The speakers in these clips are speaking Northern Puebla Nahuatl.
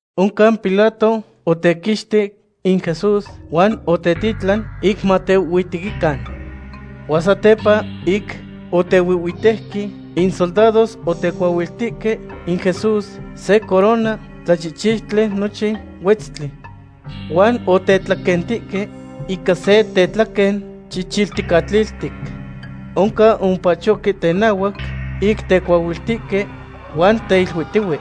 Oncan Pilato otequixtic in Jesús huan otetitlan ic matehuihhuitequican. Huan satepa ic otehuihhuitejque, in soldados otecuahuiltihque in Jesús se corona tlachihchiutli nochin huetztli. Huan otetlaquentihque ica se tetlaquen chichilticatliltic. Oncan omopachohque tenahuac ic teahuiltihque, huan teiluiltihque: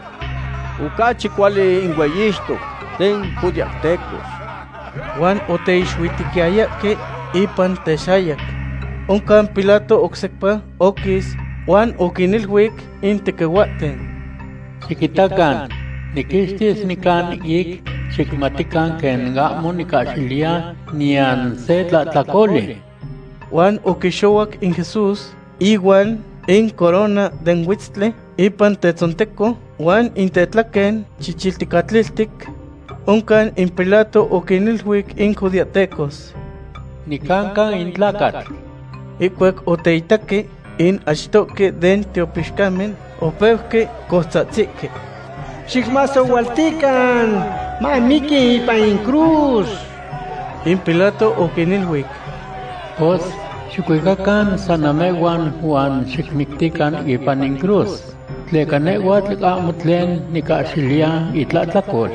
―¡Ocachi cuali in hueyixtoc den judeahtecos! Huan oteixuitequiyayahque ipan texayac. Oncan Pilato oc sepa oquis, huan oquiniluic in tequihuahten: ―Xiquitacan, niquixtis nican ic xicmatican quen ahmo nicahxiliya niyan se tlahtlacoli. Huan oquixohuac in Jesús, ihuan in corona den huetztli ipan tetzonteco huan in tetlaquen chichilticatliltic. Oncan in Pilato oquiniluic in judeahtecos: ―¡Nicanca in tlacatl! Ihcuac oteitaque, in achtohque den tiopixcamen opeuque coutzahtzihque: ―¡Xicmasohualtican; mamiqui ipan in cruz! In Pilato oquiniluic: ―Pos, xicuicacan san namehhuan huan xicmictican ipan in cruz, tleca nehhuatl ahmo tlen nicahxiliya itlahtlacol.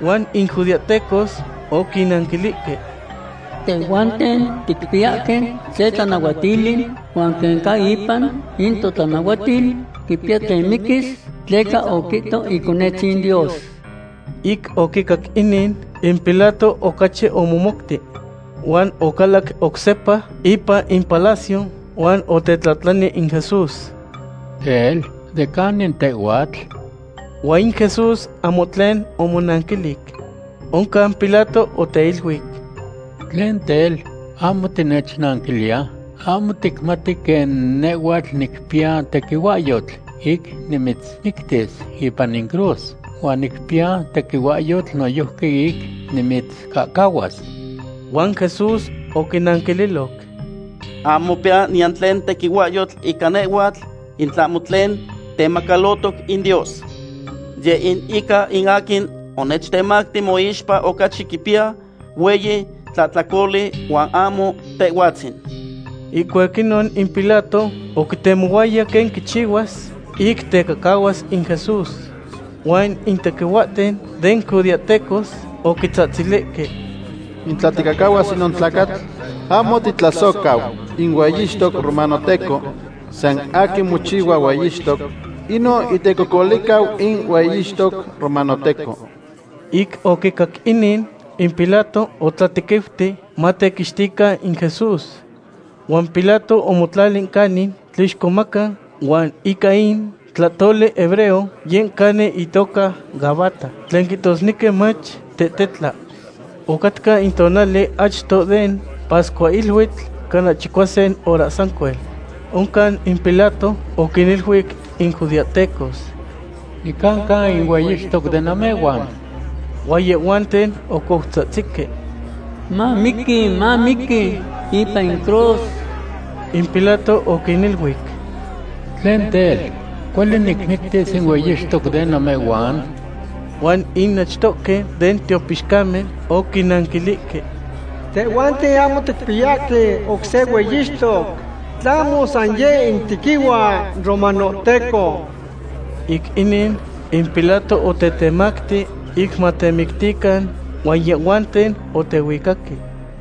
Huan in judeahtecos oquinanquilihque: ―Tehhuanten ticpiyahque se tlanahuatili, huan quen ca ipan in totlanahuatil, quipiya tlen miquis, tleca oquihto Iconetzin Dios. Ic oquicac inin, in Pilato ocachi omomouti. Huan ocalac oc sepa ipan in palacio, huan otetlahtlani in Jesús: ―Tel, ¿de canin tehhuatl? Huan in Jesús ahmo tlen omonanquilic. Oncan Pilato oteiluic: ―¿Tlen tel, ahmo tinechnanquiliya? ¿Ahmo ticmati quen nehhuatl nicpiya tequihuahyotl ic nimitzmictis ipan in cruz huan nicpiya tequihuahyotl noyojqui ic nimitzcahcahuas? Huan Jesús oquinanquililoc: ―Ahmo mopiyas niyan tlen tequihuahyotl ica nehhuatl in tlahmo tlen temacalotoc in Dios. Yeh in ica in aquin onechtemacti moixpa ocachi quipiya hueyi tlahtlacoli huan ahmo tehhuatzin. Ihcuac inon in Pilato oquitemohuaya quen quichihuas ic tecahcahuas in Jesús. Huan in tequihuahten den judeahtecos oquitzahtzilihque: ―¡In tla ticahcahuas inon tlacatl, ahmo titlasohcau in hueyixtoc romanohteco! San aquin mochihua hueyixtoc, inon itecocolihcau in hueyixtoc romanohteco. Ic oquicac inin, in Pilato otlatequiuti matequixtican in Jesús. Huan Pilato omotlali canin tlixcomaca huan ica in tlahtoli hebreo yeh canin itoca Gabata, tlen quihtosnequi mach, Tetehtla. Ocatca in tonali achto den pascuahiluitl, cana chicuasin hora sancuel. Oncan in Pilato oquiniluic in judeahtecos: ―¡Nicanca in hueyixtoc den namehhuan! Huan yehhuanten ocoutzahtzihque: ―¡Mamiqui! ¡Mamiqui ipan in cruz! In Pilato oquiniluic: ―¿Tlen tel, cuali nicmictis in hueyixtoc den namehhuan? Huan in achtohque den tiopixcamen oquinanquilihque: ―Tehhuanten ahmo ticpiyahque oc se hueyixtoc, tlahmo san yeh in tequihua romanohteco. Ic inin, in Pilato otetemacti ic matemictican, huan yehhuanten otehuicaque.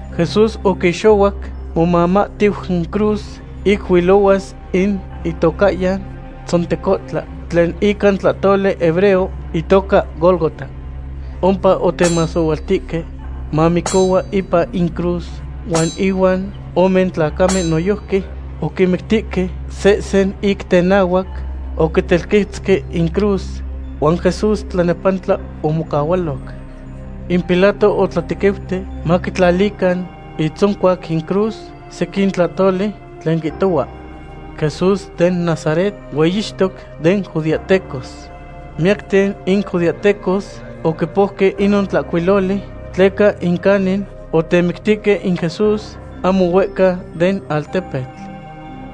Jesús oquixohuac momamahtiu in cruz, ic huilohuas in itocahyan Tzontecontla, tlen ica in tlahtoli hebreo itoca Gólgota. Ompa otemasohualtihque mamicohua ipan in cruz, huan inuan ome tlacamen noyojqui oquinmictihque, sehsen ic tenahnahuac oquintelquetzque incruz, huan Jesús tlanepantla omocahualoc. In Pilato otlatequiuti maquitlalican itzoncuac in cruz sequin tlahtoli tlen quihtohua: “Jesús den Nazaret, hueyixtoc den judeahtecos.” Miyacten in judeahtecos oquipouque inon tlahcuiloli, tleca in canin otemictihque in Jesús ahmo huehca den altepetl.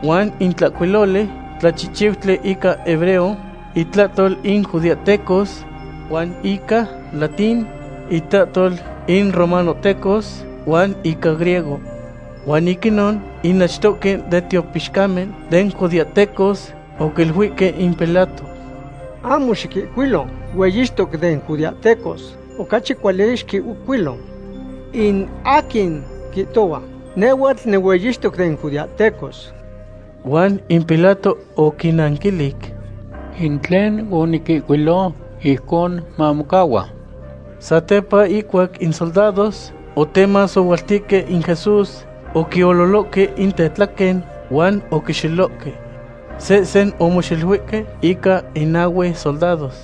Huan in tlahcuiloli tlachihchiutli ica hebreo, itlahtol in judeahtecos, huan ica latín, itlahtol in romanohtecos, huan ica griego. Huan ic inon in achtohque den tiopixcamen den judeahtecos oquiluihque in Pilato: ―Ahmo xiquihcuilo, “hueyixtoc den judeahtecos.” Ocachi cuali xiquihcuilo, “In aquin quihtohua nehhuatl nihueyixtoc den judeahtecos.” Huan in Pilato oquinnanquilic: ―In tlen oniquihcuilo, ijcon mamocahua. Satepa ihcuac in soldados otemasohualtihque in Jesús, oquiololohque in tetlaquen huan oquixelohque. Sehsen omoxeluihque ica in nahue soldados.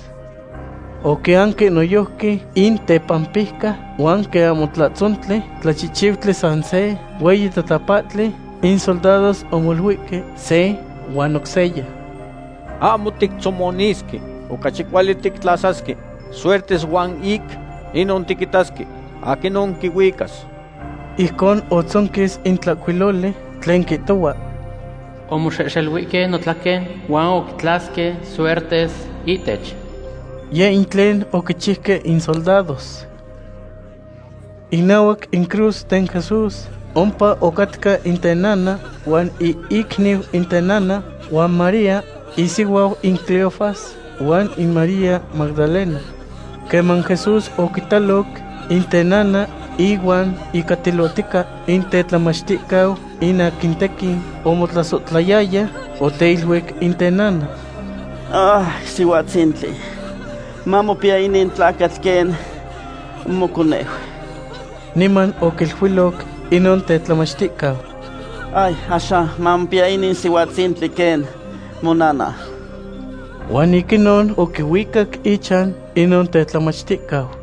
Oquianque noyojqui in tepampijca huan quen ahmo tlahtzontli, tlachihchiutli san se hueyi tatapahtli, in soldados omoluihque se huan oc seya: ―Ahmo tictzomonisque. Ocachi cuali tictlasasque suertes huan ic inon tiquitasque aquinon quihuicas. Ijcon otzonquis in tlahcuiloli tlen quihtohua: “Omoxehxeluihque notlaquen, huan oquitlasque suertes ihtech.” Yeh in tlen oquichiuque in soldados. Inahuac in cruz den Jesús ompa ocahcatca in tenana, huan in icniu in tenana, huan María isihuau in Cleofas, huan in María Magdalena. Queman Jesús oquitaloc in tenana ihuan ihcatilotica in tetlamachticau in aquin tequin omotlasohtlayaya, oteiluic in tenana: ―Sihuatzintli, mamopiya inin tlacatl quen moconeu. Niman oquiluiloc inon tetlamachticau: ―Axan mamopiya inin sihuatzintli quen monana. Huan ic inon oquihuicac ichan inon tetlamachticau.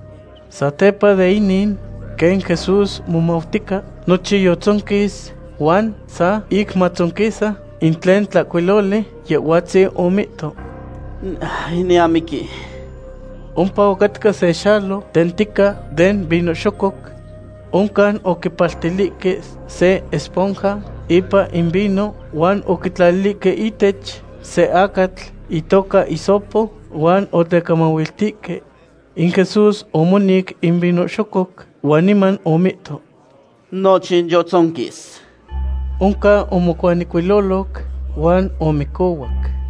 Satepa de inin, quen Jesús momautica nochin yotzonquis, huan sa ic matzonquisa in tlen tlahcuiloli, Yehhuatzin omihto: ―Niamiqui. Ompa ocatca se xalo tentica den vino xococ. Oncan oquipaltilihque se esponja ipan in vino, huan oquitlalihque ihtech se acatl itoca hisopo huan otecamahuiltihque. In Jesús omonic in vino xococ, huan niman omihto: ―Nochin yotzonquis. Oncan omocuanecuiloloc, huan omicohuac.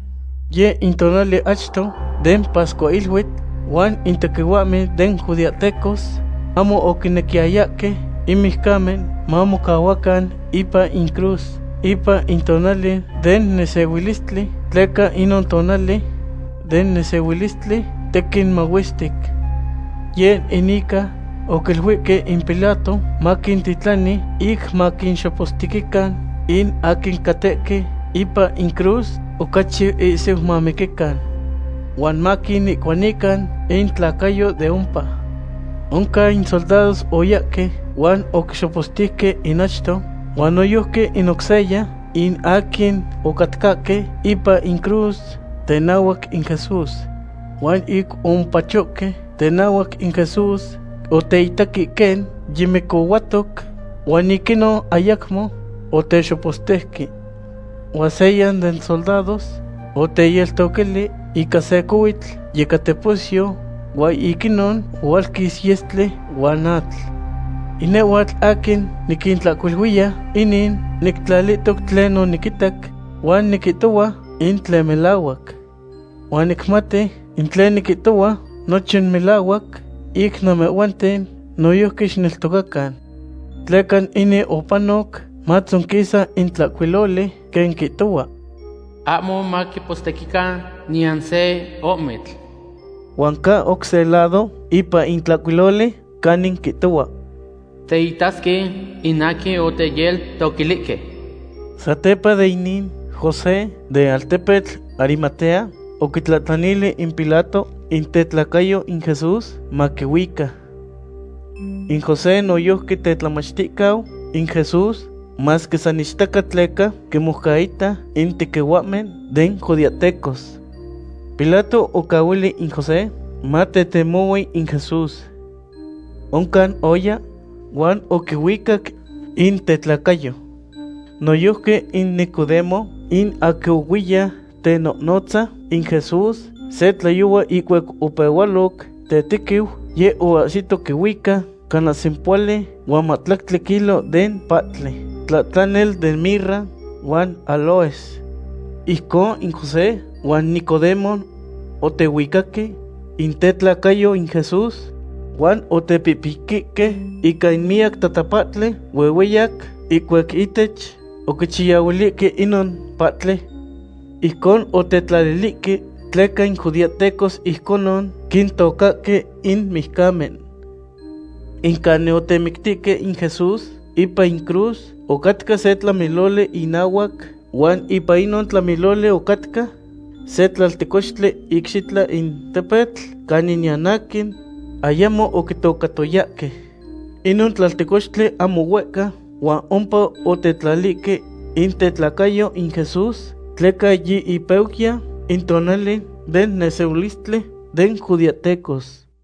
Yeh in tonali achto den pascuahiluitl, huan in tequihuahmen den judeahtecos ahmo oquinequiyayahque in mijcamen mamocahuacan ipan in cruz ipan in tonali den nesehuilistli, tleca inon tonali den nesehuilistli tequin mahuestic. Yeh in ica oquiluihque in Pilato maquintitlani ic maquinxopostequican in aquin catehque ipan incruz, ocachi ihsiu mamiquican. Huan maquinihcuanican intlacayo de ompa. Oncan in soldados oyahque huan oquixopostejque in achto, huan noyojqui in oc seya in aquin ocatcahque ipan incruz tenahuac in Jesús. Huan ic omopachohque tenahuac in Jesús, oteitaque quen yimicohuatoc, huan ic inon ayacmo otexopostejque. Huan seya den soldados oteyeltoquili ica se cohuitl yecateposyo, huan ic inon ohualquis yestli huan atl. In nehhuatl aquin niquintlahcuiluiya inin, nictlalitoc tlen oniquitac, huan niquihtohua in tlen melahuac. Huan nicmati in tlen niquihtohua nochin melahuac, ic namehhuanten noyojqui xicneltocacan. Tleca inin opanoc matzonquisa in tlahcuiloli quen quihtohua: “Ahmo maquipostequican niyan se ohmitl.” Huan ca oc se lado ipan in tlahcuiloli canin quihtohua: “Teitasque in aquin oteyeltoquilihque.” Satepa de inin, José, den altepetl Arimatea, oquitlahtlanili in Pilato in tetlacayo in Jesús maquihuica. In José noyojqui tetlamachticau in Jesús, masque san ichtaca tleca quinmoucaita in tequihuahmen den judeahtecos. Pilato oquicahuili in José matetemohui in Jesús. Oncan oya huan oquihuicac in tetlacayo. Noyojqui in Nicodemo, in aquin ohuiya tenohnotza in Jesús se tlayohua ihcuac opehualoc tetequiu, yeh oahsito quihuica cana sempohuali huan mahtlactli kilo den pahtli, tlatlanel den mirra huan áloes. Ijcon in José huan Nicodemo otehuicaque in tetlacayo in Jesús huan otepihpiquihque ica in miyac tatapahtli huehueyac ihcuac ihtech oquichayahuilihque inon pahtli. Ijcon otetlalilihque tleca in judeahtecos ijconon quintocahque in mijcamen. In canin otemictihque in Jesús ipan in cruz ocatca se tlamiloli inahuac, huan ipan inon tlamiloli ocatca se tlaltecochtli icxitlan in tepetl canin niyan aquin ayamo oquitocatoyahque. Inon tlaltecochtli ahmo huehca huan ompa otetlalihque in tetlacayo in Jesús, tleca yi ipeuyan in tonali den nesehuilistli den judeahtecos.